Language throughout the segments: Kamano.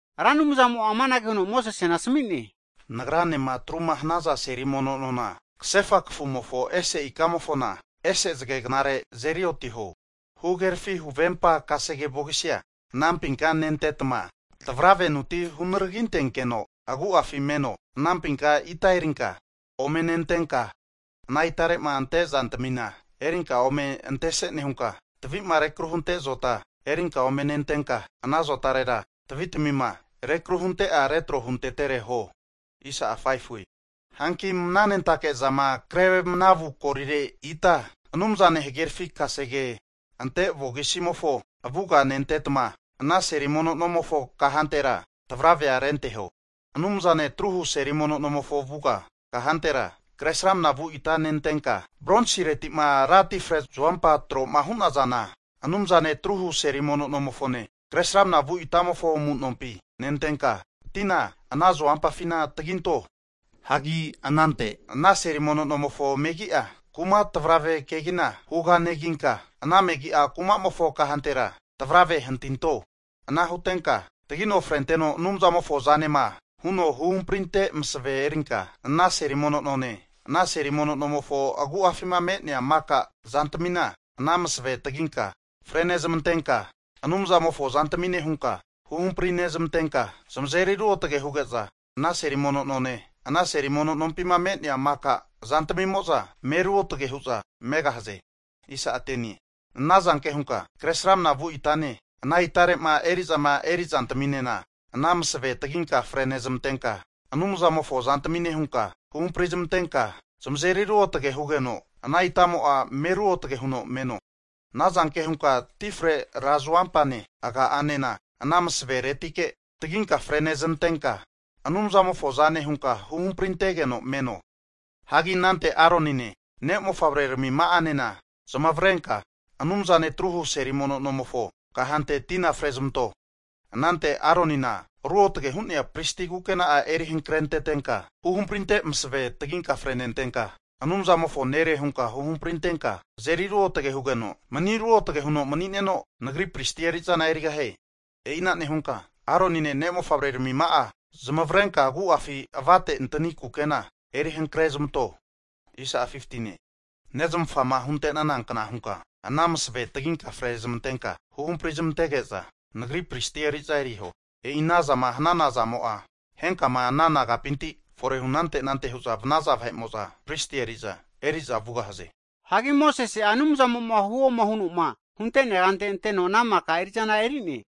Ra Anumzamo'a amanage huno Mosesena asmi'ne, Nagranema atruma hanaza seli mono nona, kasefa kafumofo ese ikamofona ese zage knare azeri otiho. Huhagerafi huvempa kasege vogisia anampinka nentetma, tavravenuti hunargintenkeno agu'afi meno. Anampinka ita erinka ome nentenka, ana itare'ma ante zantamina erinka ome antese nehunka, tavi'ma rekru hunte zota erinka ome nentenka, ana zotarera tavitamima rekru hunte'a retro huntetere huo. Hanki mnanentake zama kre mnavu golire ita Anumzane hagerafi kasege ante vokisimofo avuga'a nentetma, ana seli mono nomofo kahantera tavravea renteho. Anumzane atruhu seli mono nomofo avuga kahantera, kresramna vu ita nentenka, bronsireti'ma ra tifre zuompa tro'ma hu'nazana, Anumzane atruhu seli mono nomofone, Kresramanama vu itamofo amu'nompi nentenka tina ana zuompafina taginto. Hagi anante ana seli mono nomofo megi'a kumara tavrave kegina huganeginka, ana megi'a kumamofo kahantera tavravea hantinto. Ana hutenka, tagino frenteno Anumzamofo zanema huno huhamprinte masave erinka ana seli mono none, ana seli mono nomofo agu'afima me'nea maka zantamina ana masavea taginka frenezmantenka, Anumzamofo zantamine hunka huhamprinezmantenka zamazeri ruotage huge'za ana seli mono none, ana seli mono nompima me'nea maka zantmimo'za me ruotage hu'za megahaze. Anazanke hunka Kresramanama vu itane ana itare'ma eri'zama eri zantaminena ana masave taginka frenezmantenka, Anumzamofo zantamine hunka huhamprizmantenka zamazeri ruotage hugeno, ana itamo'a me ruotage huno meno. Anazanke hunka tifre ra zuompane aga'anena ana masaveretike taginka freneznantenka, Anumzamofo zane hunka huhamprintegeno meno. Hagi anante Aronine, ne' mofavrermima'anena zmavrenka Anumzane atru hu seli mono nomofo kahante tina frezmanto. Anante Aronina ruotage hu'nea pristi kukena eri hankrentenka, huhamprinte masave taginka frenentenka, Anumzamofo nere hunka huhamprintenka azeri ruotage hugeno mani ruotage huno mani'neno, Nagri pristi eri'zana erigahie. E'ina nehunka Aronina ne' mofavrermima'a zmavrenka agu'afi avate antani kukena eri hankre zmanto. Nezmafama hunte'nana kna hunka ana masave taginka frezmantenka, huhampri zmantege'za Nagri pristi eri'zana eriho. E'i ana zama hanana zamo'a henkama ana nagapinti fore hunante anante hu'za vanaza vahe'mo'za pristi eri'za, eri'za vugahaze. Hagi Mosese'a Anumzamo'ma huoma huno'ma hunte'nea kante anteno, ana maka eri'zana eri'ne.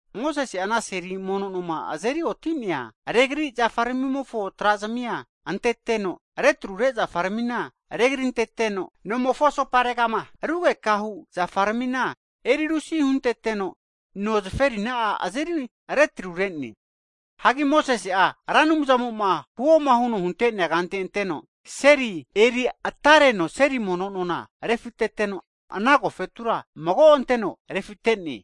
Mosese'a ana seli mono noma azeri oti'nea regri zafarmimofo tra'zmia anteteno, retrure zafaramina regrinteteno, nomofo asoparegama rugekahu zafaramina erirusi hunteteno, no zaferina'a azeri retrurene. Hagi Mosesi'a Ra Anumzamo'ma huoma huno hunte'nea kante anteno, seria eri atareno seli mono nona refiteteno, ana agofetura mago anteno refite'ne.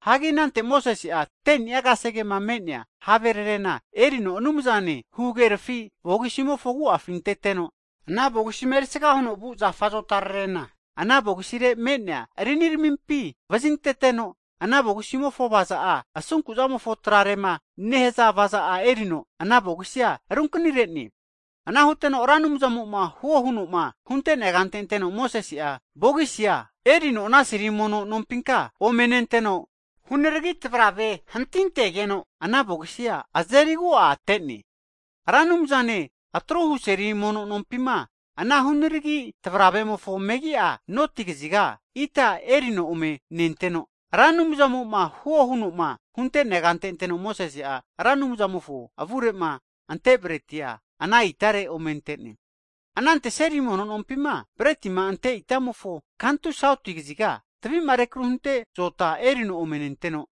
Hagi anante Mosese'a 10ni'a kasegema me'nea havererena erino Anumzane huhagerafi vogisimofo agu'afi anteteno, ana vogisima erisga huno vu azota zafararena ana vogisire me'nea riniramimpi vazinteteno, ana vogisimofo avaza'a asunku zamofo trarema nehaza avaza'a erino ana vogisia runkanire'ne. Ana huteno Ra Anumzamo'ma huo huno'ma hunte'nea kante anteno Mosese'a vogisia erino ana seli mono nompinka ome nenteno, hunaragi tavrave hantintegeno ana vogisia azeri agu'a ate'ne. Ra Anumzane atruhu seli mono nompima ana hunaragi tavravemofo megi'a noti kaziga ita erino ome nenteno, Ra Anumzamo'ma huo huno'ma hunte'nea kante anteno Mosese'a Ra Anumzamofo avure'ma ante bretia ana itare ome ante'ne. Anante seli mono nompima bretima ante itamofo kantu sauti kaziga, tavi'ma rekru hunte zota erino ome nenteno,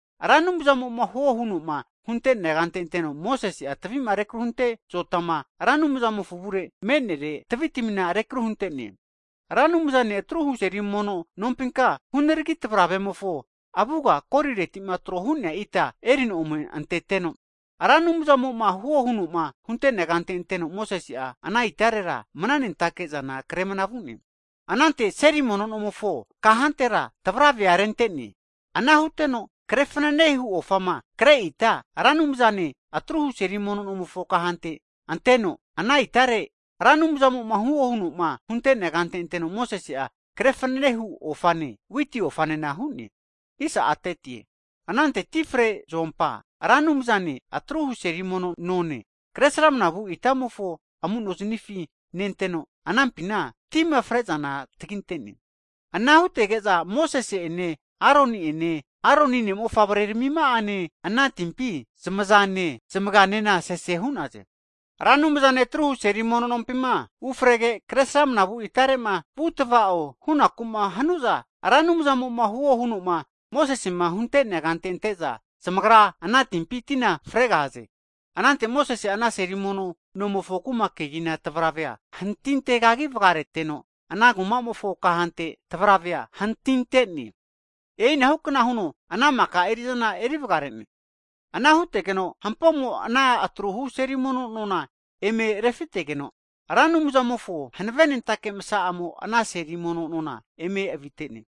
Ra Anumzamo'ma huo huno'ma hunte'nea kante anteno, Mosese'a tavi'ma rekru hunte zotama ra Anumzamofo avure me'nere tavitamina rekru hunte'ne. Ra Anumzane atruhu' seli mono nompinka hunaragi tavravemofo avuga golireti'ma tro hu'nea ita erino ome anteteno. Ra Anumzamo'ma huo huno'ma hunte'nea kante anteno Mosese'a, ana itarera mnanentake zana kre mana vu'ne. Anante ana seli mono nomofo kahantera tavravea rente'ne. Ana huteno kre fnanehu ofama kre ita Ra Anumzane atruhu seli mono nomofo kahante anteno ana itare Ra Anumzamo'ma huo huno'ma hunte'nea kante anteno Mosese'a kre fanene hu ofane witi ofanena hu'ne. Anante tifre ra zuompa Ra Anumzane atruhu seli mono none kresramnama vu' itamofo amu'noznifi nenteno anampina tima fre'zana taginte'ne. Ana hutege'za Mosese ene Aroni ene Aroni ne' mofavrermima'anena ana timpi zmazane zmaganena sese hu'naze. Ra Anumzane atruhu seli mono nompima ufrege Kresramana vu itare'ma vu tavao hunaku'ma hanu'za, Ra Anumzamo'ma huo huno'ma Mosesema hunte'nea kante ante'za zamagra ana timpi tina fregahaze. Anante Mosese'a ana seli mono nomofo kuma kegina tavravea hantintegagi vagareteno ana kuma'mofo kahante tavravea hantinte'ne. E'inahu kna huno ana maka eri'zana eri vagare'ne. Ana hutegeno hampomo ana atruhu seli mono nona eme refitegeno, Ra Anumzamofo hanavenentake msaa'amo'a ana seli mono nona eme avite'ne.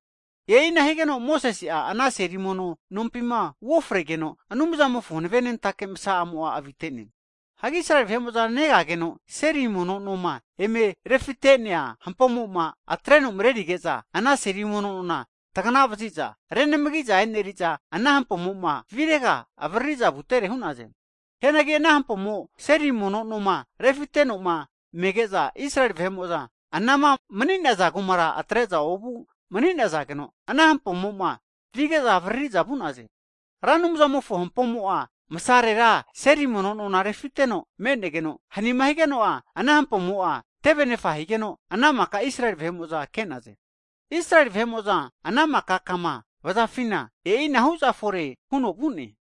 E'ina higeno Mosese'a ana seli mono nompina uofregeno, Anumzamofo hanavenentake masa'amo'a avite'ne. Israeli vahe'mo'za negageno seli mono noma eme refite'nea hampomo'ma atreno marerige'za ana seli mono nona tagana vazi'za renamagi'za e'neri'za, ana hampomo'ma virega avariri'za vutere hu'naze. Hianagi ana hampomo seli mono noma refiteteno'ma mege'za, Israeli vahe'mo'za anama mani'naza kumara atre'za ovu mani'nazageno, ana hampomo'ma vige'za avariri'za vu'naze. Ra Anumzamofo hampomo'a msarera seli mono nona refiteno me'negeno, hanima higeno'a, ana hampomo'a tevenefa higeno, ana maka Israeli vahe'mo'za ke'naze. Israeli vahe'mo'zama ana mika kama vazafina e'i ana hu'za fore huno vu'ne.